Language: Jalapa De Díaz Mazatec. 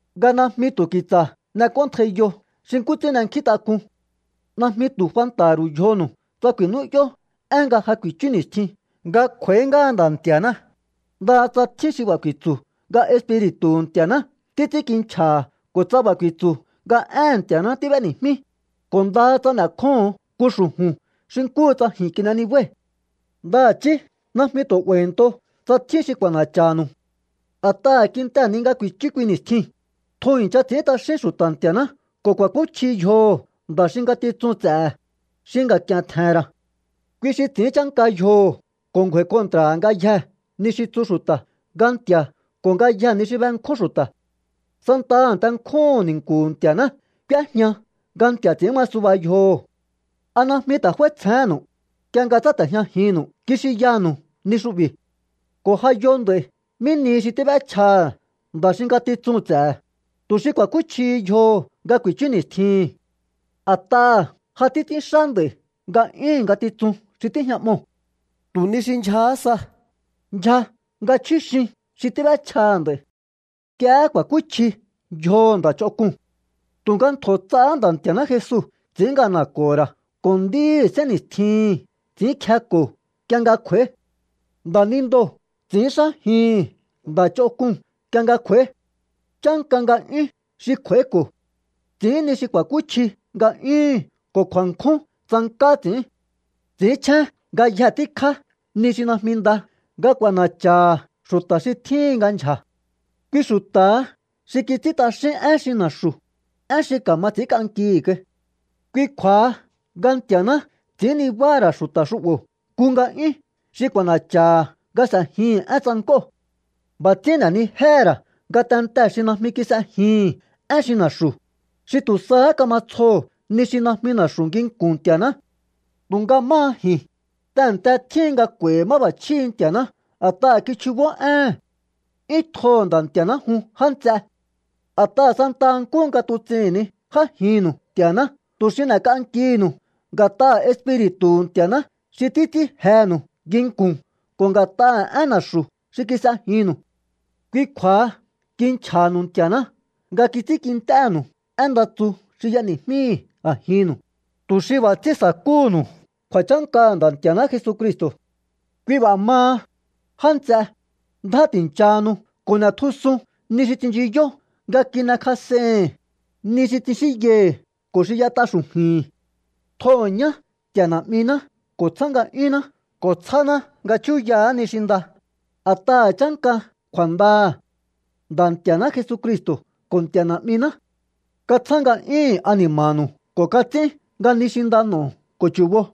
nga najmi tu̱ ki̱tsa̱ n'ek'óntjaiyo xi nkú ts'ín n'enkjíntak'un. Najmi tu̱ fanta̱ha̱ ru̱u yjonu̱u tsa ku̱i̱nú'yó én nga ja kuichu ni̱stjin nga kj'u̱a̱í ngáha Nda̱ Nti̱a̱ná, ndaha tsa tjín xi b'a̱ ku̱i̱tsu̱ nga Espiri̱tu̱hu̱ Nti̱a̱ná títs'ínkinchja̱ha̱ ko̱ tsa b'a̱ ku̱i̱tsu̱ nga éhe̱n Nti̱a̱ná tíb'éni̱jmí, ko̱ ndaha tsa n'e̱kjóho̱on nku xu̱ju̱n xi nkúhu tsa ji̱n kin'e nibái̱. Ndaha̱chí najmi tu̱ 'ba̱i̱nto tsa tjín xi k'u̱a̱na̱cha̱nu̱u. A̱t'aha̱ kintehe̱ ni nga ku̱i̱chú kui ni̱stjiu̱n, tjun i̱ncha ts'i̱ín t'axín xu̱ta̱ Nti̱a̱ná ko̱ ku̱a̱kúchji yjoho̱ nda̱ xi ngatitsuu̱n ts'e̱he̱, xi nga̱k'i̱e̱n tje̱he̱n ra̱. Kui xi ts'i̱ín chánka yjoho̱ ko̱ ngju̱a̱i̱ kontra̱ha̱ ngayjee̱ ni xi tsu xu̱ta̱ nga Nti̱a̱ ko̱ ngayjee̱ ni xi benkjún xu̱ta̱. Santaha a̱nte nkjúhu̱n ni̱nku̱hu̱ Nti̱a̱ná k'úéjña nga nti̱a̱ ts'i̱ín ma suba yjoho̱. ¿A najmi ta̱ f'áítsjehénnu̱u, nk'ie nga tsáte̱jñajinnu̱u kixinyanu̱u ni xu'bi̱? Ko̱ ja yo nd'a̱i̱ mí nihi xi tíb'échjaha̱ nda̱ xi ngatitsuu̱n ts'e̱he̱, tu̱ xi ku̱a̱kúchjihi yjoho̱ nga ku̱i̱chú ni̱stjihi̱n. A̱t'aha̱ ja títs'ínxá nd'a̱i̱ nga'yúhu̱n ngatitsun xi tíjña'moo̱. Tu̱ ni xi ndyjahá sa, ndyja nga chjúxin xi tíb'échjaha̱ nd'a̱i̱. Nk'iehé ku̱a̱kúchji yjoho̱ nda̱ ch'onk'uu̱n. Tu̱nga ntjo̱ ts'ahá Nda̱ Nti̱a̱ná Jesu ts'i̱ín ngana̱ko̱ho̱ ra̱ ko̱ nd'íhi̱ sénni̱stjihi̱n ts'i̱ínkjeko̱o nk'ie nga kj'u̱a̱í. Nda̱nindoo̱ ts'i̱ínxájihi̱n nda̱ ch'onk'uu̱n nk'ie nga kj'u̱a̱í. Chánka nga'yún xi kj'u̱a̱íko̱. Ts'i̱ín ni xi ku̱a̱kúchji nga'yúhu̱n ko̱ kju̱a̱nkjún tsank'á ts'i̱ín. Ts'i̱ínchjén ngayje tíkjá ni xi najmi nda nga k'u̱a̱na̱cha̱ha̱ xu̱ta̱ xi tjíhin nga ndyja̱. Kui xu̱ta̱ha xi kits'ín t'axín én xi na̱xu̱, én xi ka̱ma ts'i̱ínk'ankihi̱ kai. Kui kju̱a̱ha nga Nti̱a̱ná ts'i̱ín nibáha̱ ra̱ xu̱ta̱ xu'bo̱ nku nga'yún xi k'u̱a̱na̱cha̱ha̱ nga s'e̱jihi̱n én tsank'óo̱. B'a̱ ts'ín n'e̱nijéhe̱ ra̱ ngatentee̱ xi najmi kis'ejihi̱n én xi na̱xu̱, xi tu̱ sahá kama tsjoho̱ ni xi najmi na̱xu̱ nginku̱n Nti̱a̱ná. Tu̱nga máha ji̱n, tehe̱nte tjíhin nga k'u̱a̱i̱hi̱ máb'a̱chjíhi̱ Nti̱a̱ná a̱t'aha̱ kichjubó éhe̱n. 'Yún tjoho̱ Nda̱ Nti̱a̱ná jun, já nts'eé. A̱t'aha̱ santaha nkúhu nga tuts'ihi̱n ni j'ájinnu̱u Nti̱a̱ná tu̱ xi n'e̱k'ankihi̱nu̱u nga̱t'aha̱ Espiri̱tu̱hu̱ Nti̱a̱ná xi títs'ín jenu̱u nginku̱n ko̱ nga̱t'aha̱ én na̱xu̱ xi kis'ejinnu̱u. Kui kju̱a̱ha kinchja̱ha̱nu̱u Nti̱a̱ná nga kits'ínkint'énu̱u én nda tsu xi y'eni̱jmíi̱ a̱jinnu̱u, tu̱ xi b'a̱ ts'ín sa̱kúhu̱nu̱u kju̱a̱chánkaha̱ Nda̱ Nti̱a̱ná Jesucristo̱. Kui b'a̱ maha, já nts'e, ndjá ti̱nchahanu ko̱ n'e̱tjusun ni xi tsinchiyó nga kin'ekjas'ei̱hi̱n, ni xi tsixínyai̱hi̱ ko̱ xi y'ét'a xu̱ju̱i̱hi̱n. Tjoho̱ ñá Nti̱a̱ Na̱'miná ko̱ tsjá nga'yúnná ko̱ tsjáná nga chúyaha̱á ni xi nda, a̱t'aha̱ chánka kju̱a̱ndaha̱. Nda̱ Nti̱a̱ná Jesucristo̱ ko̱ Nti̱a̱ Na̱'miná katsjá nga'yúhu̱n ani̱ma̱nu̱u ko̱ kats'ín nga ni xi nda n'o̱o ko̱ chu̱bo.